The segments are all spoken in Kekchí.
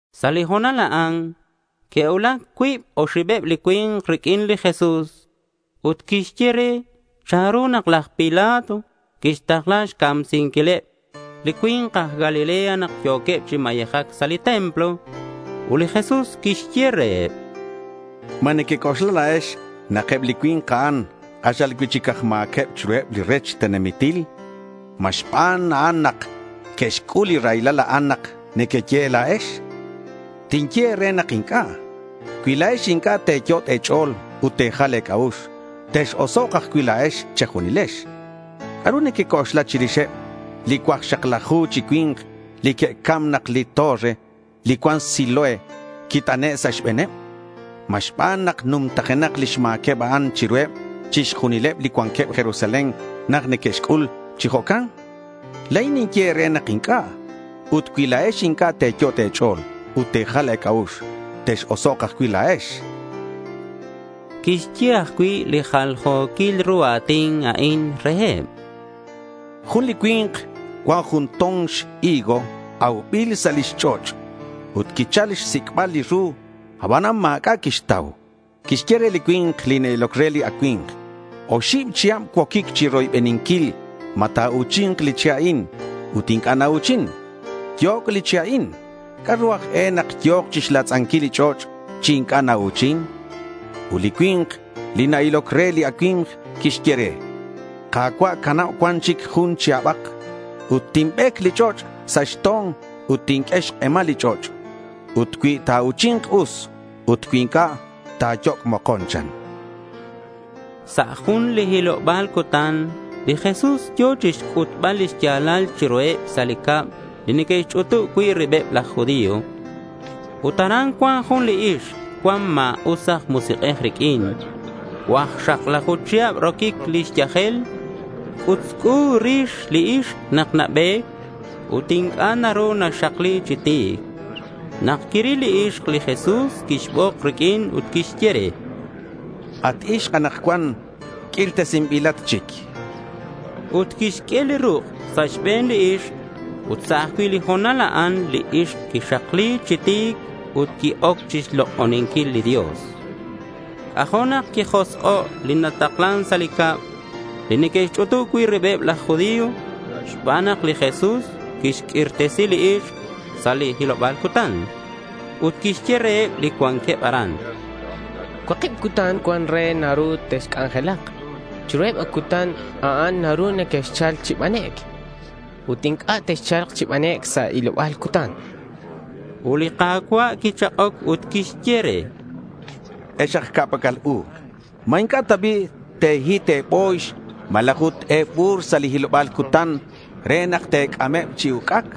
Sa' li ho̱nal a'an que'cuulac cuib oxibeb li cui̱nk riq'uin li Jesús ut que'xye re chanru nak laj Pilato quixtakla xcamsinquileb li cui̱nk aj Galilea nak yo̱queb chi mayejac sa' li templo. Ut li Jesús quixye reheb: —¿Ma nequec'oxla la̱ex nak eb li cui̱nk a'an k'axal cui'chic aj ma̱queb chiruheb li rech tenamitil? ¿Ma xban a'an nak que'xc'ul a raylal a'an nak nequeye la̱ex? chan reheb. Tinye e̱re nak inc'a'. Cui la̱ex inc'a' te̱yot' e̱ch'o̱l ut te̱jal e̱c'a'ux, tex-osok' ajcui' la̱ex che̱junilex. ¿C'a'ru nequec'oxla chirixeb li cuakxaklaju chi cui̱nk li que'cam nak li torre li cuan Siloé quit'ane' sa' xbe̱neb? ¿Ma xban nak numtajenak lix ma̱queb a'an chiruheb chixjunileb li cuanqueb Jerusalén nak que'xc'ul chi jo'can? La̱in ninye e̱re nak inc'a'. Ut cui la̱ex inc'a' te̱yot' e̱ch'o̱l ut te̱jal e̱c'a'ux, tex-osok' ajcui' la̱ex, chan li Jesús. Quixye ajcui' li jaljo̱quil ru a̱tin a'in reheb: Jun li cui̱nk cuan jun to̱n xhigo aubil sa' lix ch'och'. Ut quichal chixsic'bal li ru, abanan ma̱c'a' quixtau. Quixye re li cui̱nk li na-iloc re li acui̱mk: —Oxib chihab cuoquic chiroybeninquil ma ta̱u̱chi̱nk li che' a'in, ut inc'a' nau̱chin. Yoc' li che' a'in. ¿C'a'ru aj e nak yo̱k chixlatz'anquil li ch'och' chi inc'a' nau̱chin? chan. Ut li cui̱nk li na-iloc re li acui̱mk quixye re: —Ka̱cua', cana̱k cuan chic jun chihabak. Ut tinbec li ch'och' sa' xto̱n ut tinq'ue xk'emal li ch'och'. Ut cui ta̱u̱chi̱nk, us; ut cui inc'a', ta̱yoc' mokon, chan. Sa' jun li hiloba̱l cutan, li Jesús yo̱ chixc'utbal li xya̱lal chiruheb sa' li cab li neque'xch'utub cui' ribeb laj judío. Ut aran cuan jun li ixk cuan ma̱us aj musik'ej riq'uin. Cuakxaklaju chihab roquic lix yajel. C'utzc'u rix li ixk nak nabe̱c ut inc'a' naru naxakli chi ti̱c. Nak quiril li ixk li Jesús quixbok riq'uin ut quixye re: —At ixk, anakcuan q'uirtesinbilat chic.— Ut quixq'ue li ruk' sa' xbe̱n li ixk. Ut sa' ajcui' li ho̱nal a'an li ixk quixakli chi ti̱c ut qui-oc chixlok'oninquil li Dios. C'ajo' nak quijosk'o' li nataklan sa' li cab li neque'xch'utub cui' ribeb laj judío xban nak li Jesús quixq'uirtesi li ixk sa' li hiloba̱l cutan. Ut quixye reheb li cuanqueb aran: —Cuakib cutan cuan re nak naru texc'anjelak. Chiruheb a cutan a'an naru nequexchal chi banec' ut inc'a' texcha̱lk chi banec' sa' li hiloba̱l cutan, chan. Ut li Ka̱cua' quichak'oc ut quixye re: —¡Ex aj ca'pac'al u! ¿Ma inc'a' ta bi' te̱hit e̱bo̱yx malaj ut e̱bu̱r sa' li hiloba̱l cutan re nak te̱c'ameb chi uc'ac?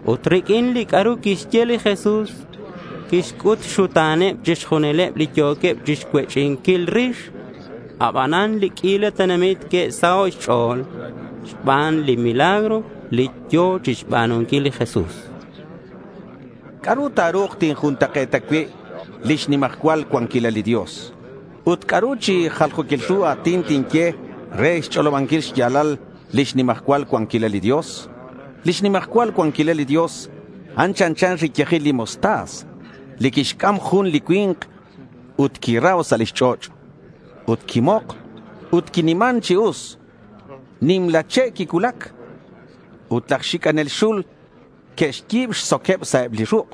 Ut riq'uin li c'a'ru quixye li Jesús, quixc'ut xxuta̱neb chixjunileb li yo̱queb chixcuech'inquil rix. Abanan li q'uila tenamit que'saho' xch'o̱l xbaneb li milagro li yo̱ chixba̱nunquil li Jesús. —¿C'a'ru ta̱ru̱k tinjuntak'e̱ta cui' lix nimajcual cuanquilal li Dios? chan li Jesús. Ut, ¿c'a'ru chi jaljo̱quil ru a̱tin tinye re xch'olobanquil xya̱lal lix nimajcual cuanquilal li Dios? Lix nimajcual cuanquilal li Dios, a'an chanchan riyajil li mostaza, li quixc'am jun li cui̱nk ut quirau sa' lix ch'och'. Ut quimok ut quiniman chi us. Nimla che' quicuulac. Ut laj xic'anel xul neque'xyi̱b xsoqueb sa' eb li ruk'.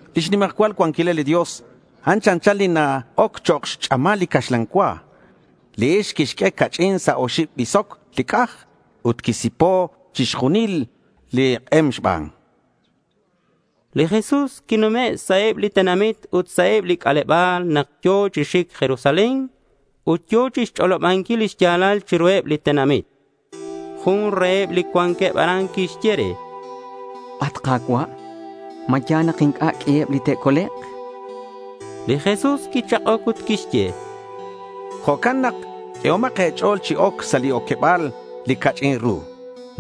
Lix nimajcual cuanquilal li Dios, a'an chanchan li na-oc chok' xch'amal li caxlan cua. Li ixk quixq'ue ca'ch'in sa' oxib bisoc li c'aj ut quisipo' chixjunil li k'em xban. Li Jesús quinume' sa' eb li tenamit ut sa' eb li c'aleba̱l nak yo̱ chi xic Jerusalén ut yo̱ chixch'olobanquil li xya̱lal chiruheb li tenamit. Jun reheb li cuanqueb aran quixye re: —At Ka̱cua', ¿ma ya̱l nak inc'a' q'uiheb li te'colek'? chan re. Li Jesús quichak'oc ut quixye: —Jo'can nak q'uehomak e̱ch'o̱l chi oc sa' li oqueba̱l li ca'ch'in ru.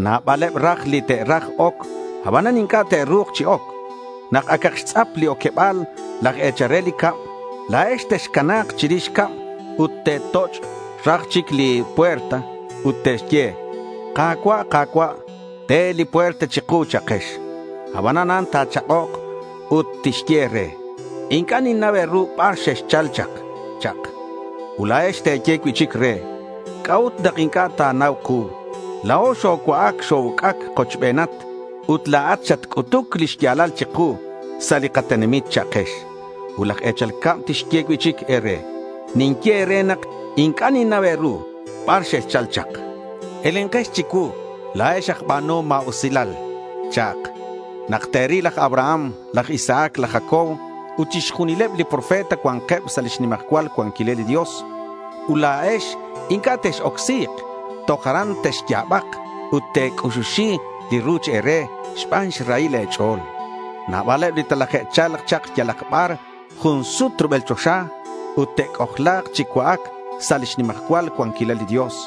Nabaleb raj li te'raj oc, abanan inc'a' te'ru̱k chi oc. Nak acak xtz'ap li oqueba̱l laj e̱chal re li cab, la̱ex texcana̱k chirix cab ut te̱toch' raj chic li puerta ut te̱ye, “Ka̱cua', Ka̱cua', te li puerta chiku”, cha'kex. Abanan a'an ta̱chak'ok ut tixye e̱re, “Inc'a' ninnau e̱ru bar xexchal chak”, cha'ak. Ut la̱ex te̱ye cui'chic re, “¿C'a'ut nak inc'a' ta̱nau ku? La̱o xocua'ac xo-uc'ac kochbenat. Ut la̱at xatc'utuc li xya̱lal chiku sa' li katenamit”, cha'kex. Ut laj e̱chal cab tixye cui'chic e̱re, “Ninye e̱re nak inc'a' ninnau bar xexchal chak. Elenkex chicuu, la̱ex aj ba̱nuhom ma̱usilal”, cha'ak. Nak te̱ril laj Abraham, laj Isaac, laj Jacob ut chixjunileb li profeta cua̱nkeb sa' lix nimajcual cuanquilal li Dios, ut la̱ex inc'a' tex-ocsi̱k, toj aran texya̱bak ut te̱c'uxuxi li ruch e̱re xban xrahil e̱ch'o̱l. Nabaleb li telaje'cha̱lk chak yalak bar jun sut rubel choxa, ut te'c'ojla̱k chi cua'ac sa' lix nimajcual cuanquilal li Dios.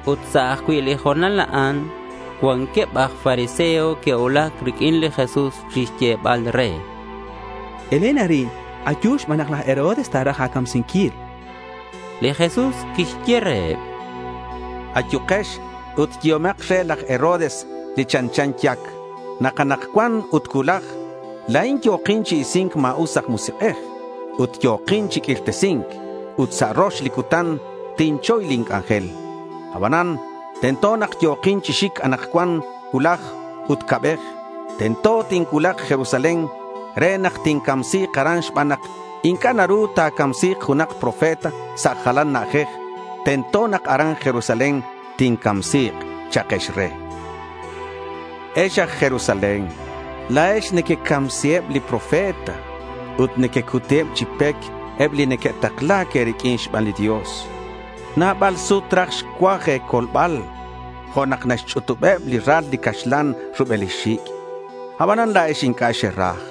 Ut sa' ajcui' li ho̱nal a'an cuanqueb aj fariseo que'cuulac riq'uin li Jesús chixyebal re: —Elen arin. Ayu xban nak laj Herodes ta̱raj a̱camsinquil, chanqueb. Li Jesús quixye reheb: —Ayukex ut yehomak re laj Herodes li chanchan yac nak anakcuan ut cuulaj la̱in yo̱kin chi isi̱nc ma̱us aj musik'ej ut yo̱kin chi q'uirtesi̱nc. Ut sa' rox li cutan tinchoy lin c'anjel. Abanan tento nak yo̱kin chi xic anakcuan, cuulaj, ut ca'bej. Tento tincuulak Jerusalén re nak tincamsi̱k aran xban nak inc'a' naru ta̱camsi̱k junak profeta sa' jalan na'ajej. Tento nak aran Jerusalén tincamsi̱k, cha'kex re. Ex aj Jerusalén, la̱ex nequecamsiheb li profeta ut nequecuti chi pec eb li neque'takla̱c e̱riq'uin xban li Dios. Nabal sut raj xcuaj e̱colbal jo' nak naxch'utubeb li ral li caxlan rubel lix xic'. Abanan la̱ex inc'a' xeraj.